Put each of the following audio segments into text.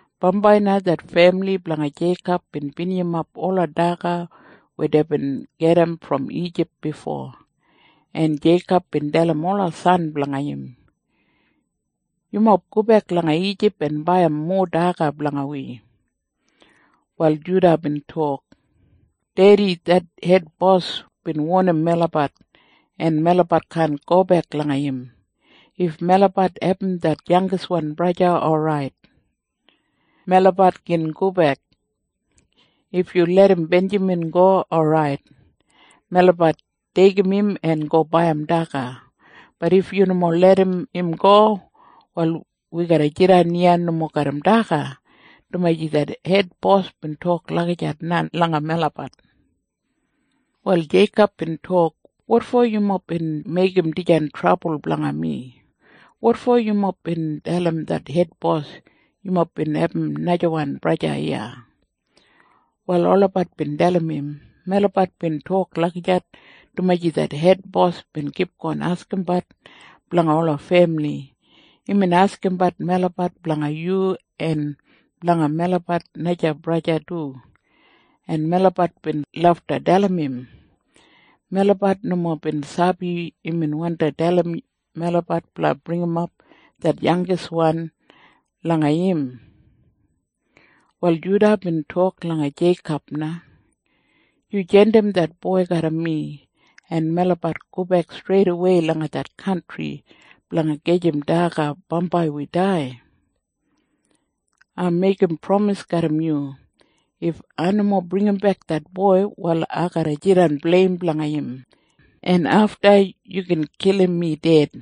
Bambai na det femili blanga Jeikob bin binijimap ola daga weya deibin gedim brom Ijip bifo, en Jeikob bin dalim ola san blanga im, “Yumob gobek langa Ijip en baiyim mowa daga blanga wi.” Wal Juda bin tok, “Dedi, det hedbos bin wonim melabat, en melabat kaan gobek langa im. If melabat abum det yangiswan braja, orait. Melabat gin gobek. If yu larram Benjamin go, orait. Melabat deigim im en go baiyim daga. Bat if yu nomo larram im go, wal wi garra jidan iya nomo garram daga, dumaji det hedbos bin tok lagijat na langa melabat.” Wal Jeikob bin tok, “Wotfo yumob bin meigim dijan trabul blanga mi. Wotfo yumob bin dalim det hedbos yumob bin abum najawan braja iya.” Wal olabat bin dalim im, “Melabat bin tok lagijat dumaji det hedbos bin kipgon askimbat blanga ola femili. Imbin askimbat melabat blanga yu en blanga melabat naja braja du. En melabat bin lafta dalim im. Melabat nomo bin sabi imbin wandi dalim melabat blanga bringimap det yangiswan langa im.” Wal Juda bin tok langa Jeikob na, “Yu jandim det boi garram mi, en melabat gobek streidawei langa det kantri blanga gajim daga bambai wi dai. Ai meigim pramis garram yu. If ai nomo bringimbek det boi, wal ai garra jidan bleim blanga im, en afta yu gin kilim mi ded.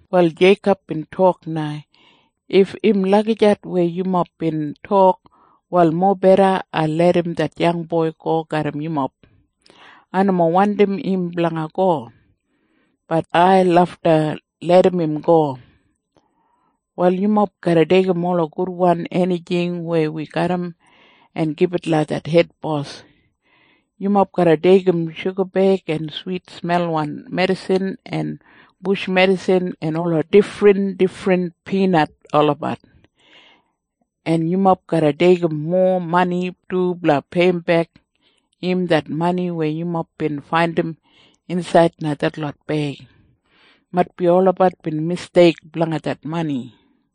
Wal Jeikob bin tok na, “If im lagijat weya yumob bin tok, wal mobeda ai larram det yangboi go garram yumob. Ai nomo wandim im blanga go. Bat ai lafta larram im go. “Wal yumob garra deigim ola gudwan enijing weya wi garram en gibit langa det hedbos. Yumob garra deigim shugabeig en switsmelwan medisin en bush medisin en ola difrindifrin pinat olabat, en yumob garra deigim mowa mani du blanga peiyimbek im det mani weya yumob bin faindim insaid langa detlot beig. Maitbi olabat bin misteik blanga det mani.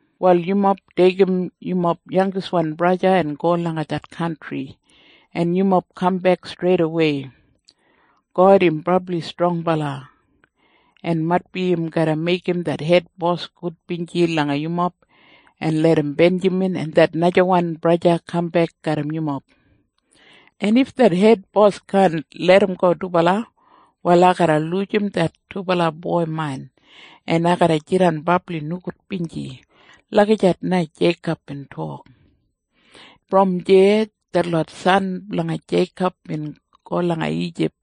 “Wal yumob deigim yumob yangiswan braja en go langa det kantri, en yumob kambek streidawei. God im brabli strongbala. En maitbi im garra meigim det hedbos gudbinji langa yumob en larram Benjamin en det najawan braja kambek garram yumob. En if det hedbos kaan larramgo dubala, wal ai garra lujim det dubala boi main, en ai garra jidan brabli nogudbinji.” Lagijat na Jeikob bin tok. Brom deya detlot san blanga Jeikob bin go langa Ijip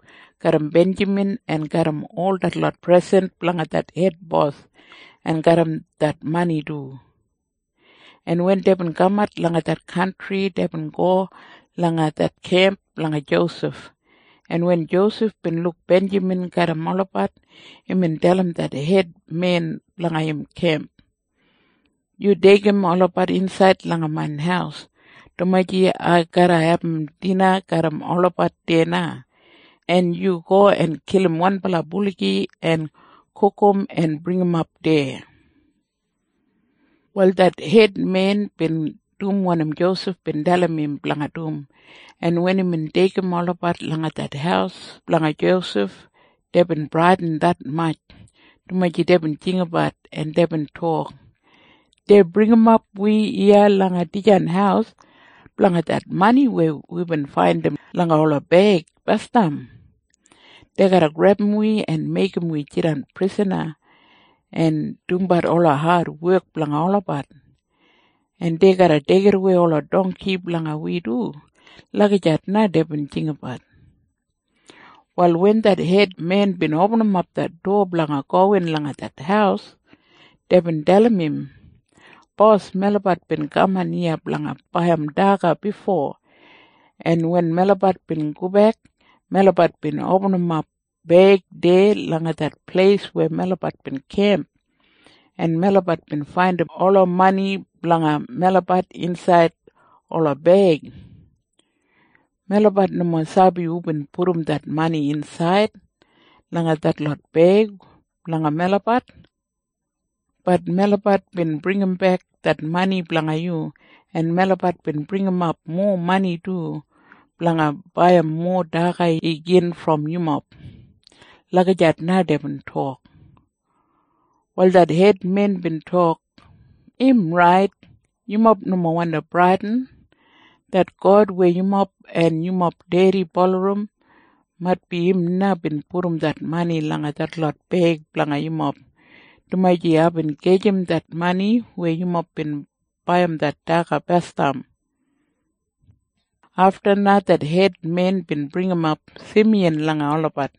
garram Benjamin en garram ol detlot presen blanga det hedbos en garram det mani du. En wen deibin kamat langa det kantri, deibin go langa det kemp blanga Josef, en wen Josef bin luk Benjamin garram olabat, imbin dalim det hedmen blanga im kemp, “Yu deigim olabat insaid langa main haus, dumaji ai garra abum dina garram olabat deya na. En yu go en kilim wanbala buligi en gugum en bringimap deya.” Wal det hedmen bin dum wanim Josef bin dalim im blanga dum, en wen imbin deigim olabat langa det haus blanga Josef, deibin bradin detmatj, dumaji deibin jinggabat, en deibin tok, “Dei bringimap wi iya langa dijan haus blanga det mani weya wibin faindim langa ola beig basdam. Dei garra grebum wi en meigim wi jidan prisana en dumbat ola adwek blanga olabat. En dei garra deigidawei ola dongki blanga wi du.” Lagijat na deibin jinggabat. Wal wen det hedmen bin opinim det dowa blanga gowin langa det haus, deibin dalim im. “Bos, melabat bin kaman iya blanga baiyim daga bifo, en wen melabat bin gobek, melabat bin opinimap beig deya langa det pleis weya melabat bin kemp, en melabat bin faindim ola mani blanga melabat insaid ola beig. Melabat nomo sabi hubin pudum det mani insaid langa detlot beig blanga melabat. Bat melabat bin bringimbek det mani blanga yu, en melabat bin bringimap mowa mani du blanga baiyim mowa daga igin brom yumob.” Lagijat na deibin tok. Wal det hedmen bin tok, “Im rait. Yumob nomo wandi bradin. Det God weya yumob en yumob dedi bulurrum, maitbi im na bin pudum det mani langa detlot beig blanga yumob, dumaji aibin gajim det mani weya yumob bin baiyim det daga basdam.” Afta na det hedmen bin bringimap Simiyan langa olabat,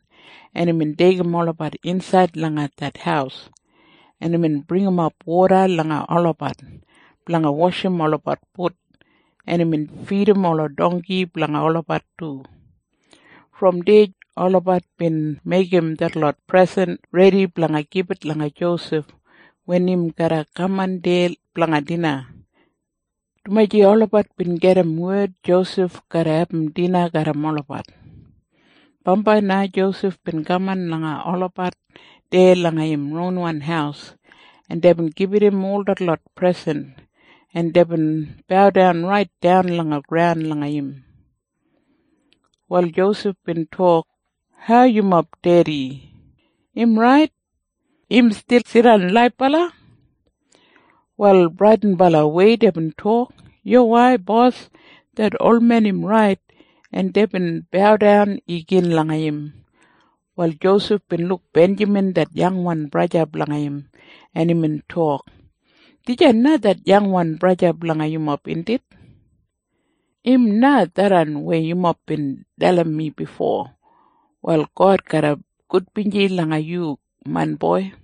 en imbin deigim olabat insaid langa det haus, en imbin bringimap woda langa olabat blanga washim olabat fut, en imbin fidim ola dongki blanga olabat du. Brom deya olabat bin meigim detlot presen redi blanga gibit langa Josef wen im garra kaman deya blanga dina, dumaji olabat bin gedim wed Josef garra abum dina garram olabat. Bambai na Josef bin kaman langa olabat deya langa im ronwan haus, en deibin gibit im ol detlot presen, en deibin baudan raitdan langa graun langa im. Wal Josef bin tok, “Hau yumob dedi? Im orait? Im stil jidan laibala?” Wal bradinbalawei deibin tok, “Yuwai, bos. Det olmen im rait.” En deibin baudan igin langa im. Wal Josef bin luk Benjamin det yangwan braja blanga im, en imbin tok, “Dijan na det yangwan braja blanga yumob, indit? Im na tharran weya yumob bin dalim mi bifo. Wal God garra gudbinji langa yu, main boi.”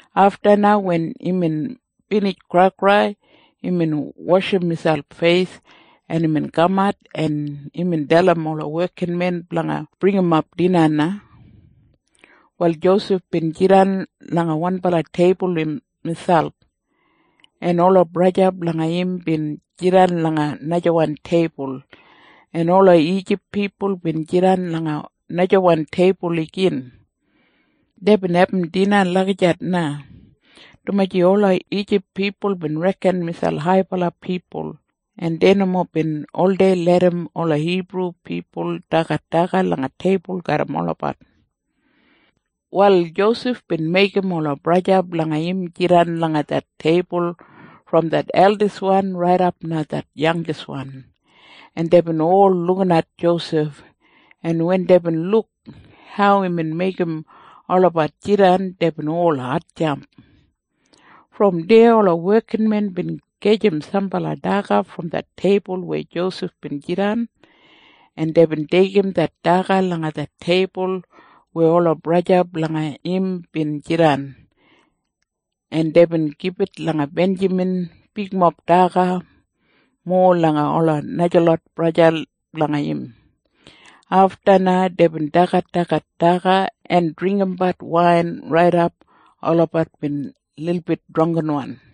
Afta na wen imbin binij kraikrai, imbin washim miselp feis, en imbin kamat, en imbin dalim ola wekinmen blanga bringimap dina na. Wal Josef bin jidan langa wanbala teibul miselp, en ola braja blanga im bin jidan langa najawan teibul, en ola Ijip pipul bin jidan langa najawan teibul igin. Deibin abum dina lagijat na, dumaji ola Ijip pipul bin reken miselp haibala pipul, en dei nomo bin oldei larram ola Hibru pipul dagat daga langa teibul garram olabat. Wal Josef bin meigim ola braja blanga im jidan langa det teibul brom det eldiswan raidap langa det yangiswan. En deibin ol lukinat Josef, en wen deibin luk hau imbin meigim olabat jidan, deibin ol hatjamp. Brom deya ola wekinmen bin gajim sambala daga brom det teibul weya Josef bin jidan, en deibin deigim det daga langa det teibul weya ola braja blanga im bin jidan, en deibin gibit langa Benjamin bigmob daga mowa langa ola najalot braja blanga im. Afta na deibin dagadagat daga en dringgimbat wain raidap olabat bin lilbit drangginwan.